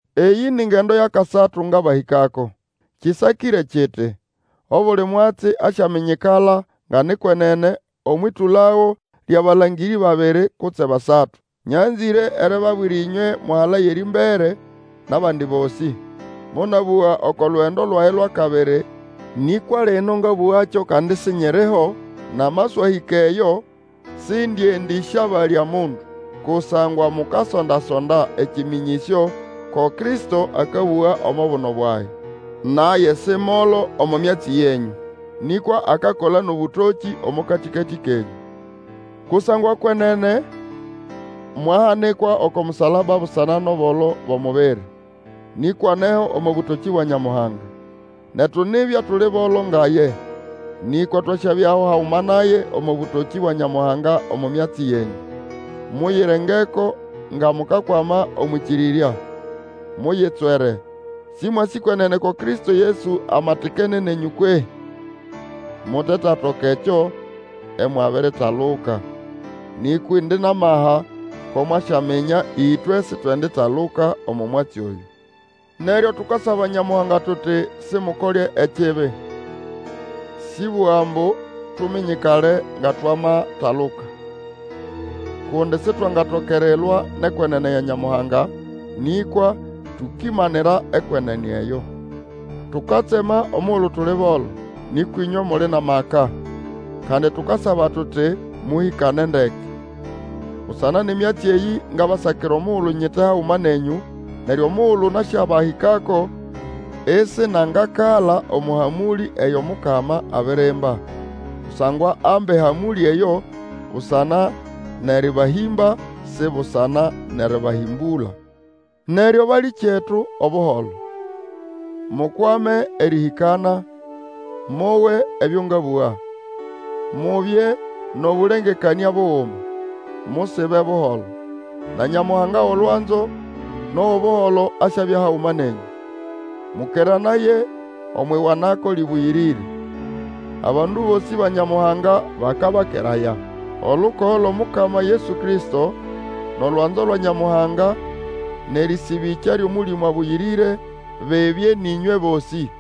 Eyĩ ni ngendo yʼakasatu ngabahĩkako. Kĩsakĩre kiti, Obuli mwatsi asyaminyikala nga ni kwenene omwʼĩtũlago lyʼabalangĩrĩ babiri, kutse basatu. Nyanzĩre eribabwira ĩnywe mwahalaya erĩmbere, nʼabandi bosĩ. Monabũga oko lugendo lwage lwʼakabiri, nĩkwa lino ngabũgakyo kandi isinyiriho, nyiti, namaswahĩka eyo, sĩndĩendĩsyabalya mundu. Kusangwa mukasonda-sonda ekĩmĩnyĩsyo ko Kristo akabũga omo buno bwage. Naye si molo omo myatsi yenyũ, nĩkwa akakola nʼobũtokĩ omo katĩkatĩ kenyũ. Kusangwa kwenene mwahanikwa oko musalaba busana nʼobolo bwʼomubiri, nĩkwa aneho omo bũtokĩ bwa Nyamuhanga. Netu nibya tuli bolo nga ye, nĩkwa twasyabyaho haguma naye omo bũtokĩ bwa Nyamuhanga omo myatsi yenyũ. Muyirengeko nga mukakwama omwʼĩkĩrĩrya; muyitswere! Sĩmwasĩ kwenene ko Kristo Yesu amatikene nenyũ kwehĩ? Mutetatoka ekyo imwabiritaluka. Nĩkwa indi nʼamaha ko mwasyaminya ĩtwe sitwenditaluka omo mwatsi oyũ. Neryo tukasaba Nyamuhanga tuti Simukole ekibi, sĩʼbũga ambu tuminyikale nga twamataluka. Kundi Sitwangatoka erilwa nʼekwenene ya Nyamuhanga, nĩkwa tukimanira ekwenene eyo. Tukatsema omugulu tuli bolo, nĩkwa ĩnywe muli nʼamaka; kandi tukasaba tuti, mũhĩkane ndeke. Busana nʼemyatsi eyĩ, ngabasakira omugulu nyite haguma nenyũ, neryo omugulu nasyabahĩkako, isinangakala omo hamũlĩ eyo Mukama abirimba. Kusangwa amba ehamũlĩ eyo busana nʼerĩbahĩmba, si busana nʼerĩbahĩmbũla. Neryo balĩkyetu, Obuholo! Mukwame erĩhĩkana, mowe ebyo ngabũga; mubye nʼobũlengekanĩa buguma, musibe buholo; na Nyamuhanga wʼolwanzo nʼowʼobuholo asyabya haguma nenyũ. Mũkeranaye omwʼiwanako lĩbũyĩrĩre. Abandu bosĩ ba Nyamuhanga bakabakeraya. Olukogo lwʼOmukama Yesu Kristo, nʼolwanzo lwa Nyamuhanga, nʼerĩsĩbĩkya lyʼOmũlĩmũ Abũyĩrĩre, bibye nʼĩnywe bosĩ.